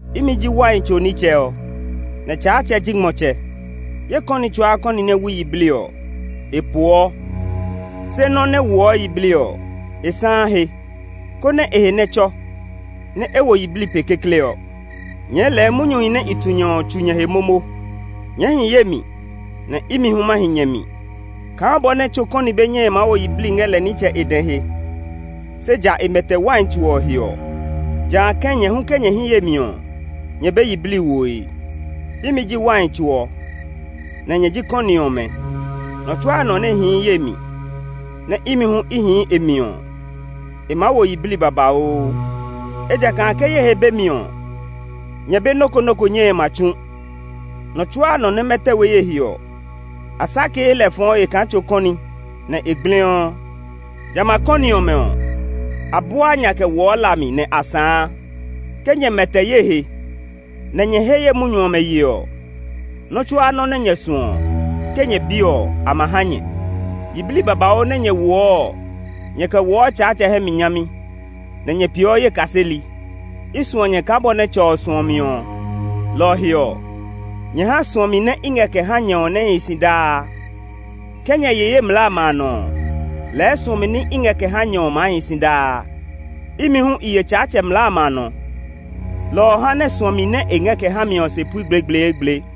“Imi ji wai tso nitsɛ ɔ, nɛ Tsaatsɛ ji ngmɔtsɛ. Ye kɔni tsuaa kɔni nɛ wui yiblii ɔ, e poɔ; se nɔ́ nɛ woɔ yiblii ɔ, e sãã he, konɛ e he nɛ tsɔ, nɛ e wo yiblii pe kekle ɔ. Nyɛɛ lɛɛ munyuhi nɛ i tu nyɛ ɔ tsu nyɛ he momo. Nyɛɛ hi ye mi nɛ imi hu ma hi nyɛ mi. Kaa bɔ nɛ tso kɔni be nyɛe maa wo yiblii ngɛ lɛ nitsɛ e dɛ he, se ja e mɛtɛ wai tso ɔ he ɔ, jã kɛ̃ nyɛ hu ke nyɛ hi ye mi ɔ, nyɛ be yiblii woe. “Imi ji wai tso ɔ, nɛ nyɛ ji kɔni ɔmɛ. Nɔ tsuaa nɔ nɛ hii ye mi, nɛ imi hu i hii e mi ɔ, e maa wo yiblii babauu, ejakaa ke ye he be mi ɔ, nyɛ be nɔ́ ko nɔ́ ko nyɛe ma tsu. Nɔ tsuaa nɔ nɛ mɛtɛ we ye he ɔ, a sakee lɛ fɔɔ he kaa tso kɔni, nɛ e gbliɔ. Jamɛ a kɔni ɔmɛ ɔ, a buaa nya kɛ woɔ la mi nɛ a sãã. Ke nyɛ mɛtɛ ye he, nɛ nyɛ he ye munyu ɔmɛ ye ɔ, nɔ́ tsuaa nɔ́ nɛ nyɛ suɔ ɔ, ke nyɛ bi ɔ, a ma ha nyɛ. Yiblii babauu nɛ nyɛ woɔ ɔ, nyɛɛ kɛ woɔ Tsaatsɛ hɛ mi nyami, nɛ nyɛ peeɔ ye kaseli. I suɔ nyɛ kaa bɔ nɛ Tsɛ ɔ suɔ mi ɔ, lɔ ɔ he ɔ, nyɛ ha suɔmi nɛ i ngɛ kɛ ha nyɛ ɔ nɛ hi si daa. Ke nyɛ ye ye mlaa amɛ a nɔ ɔ, lɛɛ suɔmi nɛ i ngɛ kɛ ha nyɛ ɔ maa hi si daa. Imi hu i ye Tsaatsɛ mlaa amɛ a nɔ, lɔ ɔ ha nɛ suɔmi nɛ e ngɛ kɛ ha mi ɔ se pui gblegbleegble.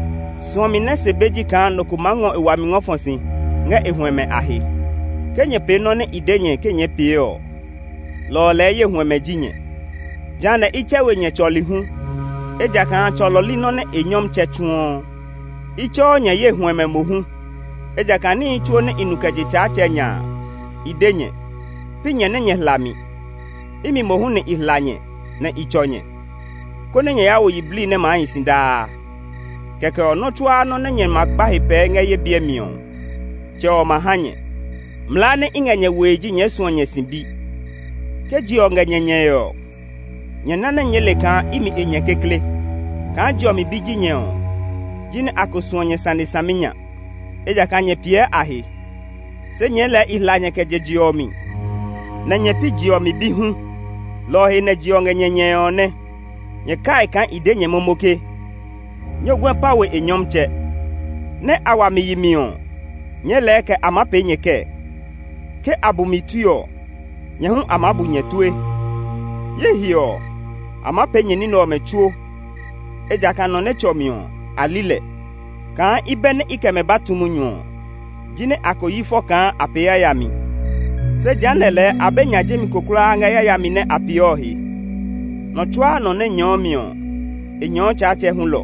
Suɔmi nɛ se be ji kaa nɔ ko maa ngɔ e wami ngɔ fɔ si ngɛ e huɛmɛ a he. Ke nyɛ pee nɔ́ nɛ i de nyɛ ke nyɛɛ pee ɔ, lɔ ɔ lɛɛ ye huɛmɛ ji nyɛ. Jehanɛ i tsɛ we nyɛ tsɔli hu, ejakaa tsɔlɔ li nɔ́ nɛ e nyɔmtsɛ tsuɔ. I tsɛɔ nyɛ ye huɛmɛ mohu, ejakaa níhi tsuo nɛ i nu kɛ je Tsaatsɛ nya a, i de nyɛ. Pi nyɛ nɛ nyɛ hla mi. Imi mohu nɛ i hla nyɛ nɛ i tsɔ nyɛ, konɛ nyɛ ya wo yiblii nɛ maa hi si daa. Kɛkɛ ɔ, nɔ́ tsuaa nɔ́ nɛ nyɛ ma kpa he pɛɛ ngɛ ye biɛ mi ɔ, Tsɛ ɔ ma ha nyɛ. Mlaa nɛ i ngɛ nyɛ woe ji nyɛɛ suɔ nyɛ sibi. “Ke je ɔ ngɛ nyɛ nyɛe ɔ, nyɛ na nɛ nyɛɛ le kaa imi a nyɛ kekle. Kaa je ɔ mi bi ji nyɛ ɔ, jinɛ a ko suɔ nyɛ sane saminya, ejakaa nyɛ piɛ a he. Se nyɛɛ lɛɛ i hla nyɛ kɛ je je ɔ mi, nɛ nyɛ pi je ɔ mi bi hu; lɔ ɔ he nɛ je ɔ ngɛ nyɛ nyɛe ɔ nɛ. Nyɛ kai kaa i de nyɛ momo ke, ‘Nyɔguɛ pã we e nyɔmtsɛ.’ Nɛ́ a wa mi yi mi ɔ, nyɛɛ lɛɛ kɛ a maa pee nyɛ kɛɛ? Ke a bu mi tue ɔ, nyɛ hu a maa bu nyɛ tue. Ye he ɔ, a maa pee nyɛ ní nɛ ɔmɛ tsuo, ejakaa nɔ nɛ tsɔ mi ɔ, a li lɛ. Kaa i bɛ nɛ i kɛ mɛ ba tu munyu ɔ, jinɛ a ko yi fɔ kaa a pee yayami. Se jehanɛ lɛɛ a be nya jemi ko kulaa ngɛ yayami nɛ a pee ɔ he. Nɔ tsuaa nɔ nɛ nyɛɔ mi ɔ, e nyɛɔ Tsaatsɛ hulɔ.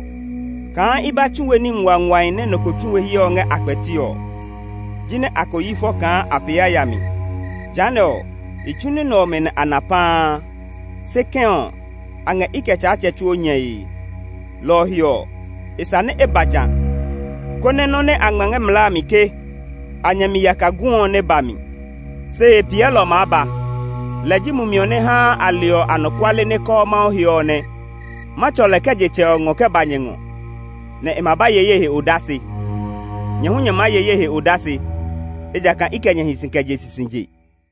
Kaa i ba tsu we ní nguanguahi nɛ nɔ ko tsu we hyɛ ɔ ngɛ a kpɛti ɔ, jinɛ a ko yi fɔ kaa a pee yayami. Jehanɛ ɔ, i tsu ní nɛ ɔmɛ nɛ a na paa; se kɛ̃ ɔ, a ngɛ i kɛ Tsaatsɛ tsuo nyɛe. Lɔ ɔ he ɔ, e sa nɛ e ba jã, konɛ nɔ́ nɛ a ngma ngɛ a mlaa a mi ke, ‘A nyɛ mi yaka gu’ ɔ nɛ ba mi. “Se Hepiɛlɔ ɔ maa ba. Lɛ ji Mumi ɔ nɛ haa a leɔ anɔkuale nɛ kɔɔ Mawu he ɔ nɛ. Ma tsɔ lɛ kɛ je Tsɛ ɔ ngɔ kɛ ba nyɛ ngɔ, nɛ e ma ba ye ye he odase. Nyɛ hu nyɛ maa ye ye he odase, ejakaa i kɛ nyɛ hi si kɛ je sisije.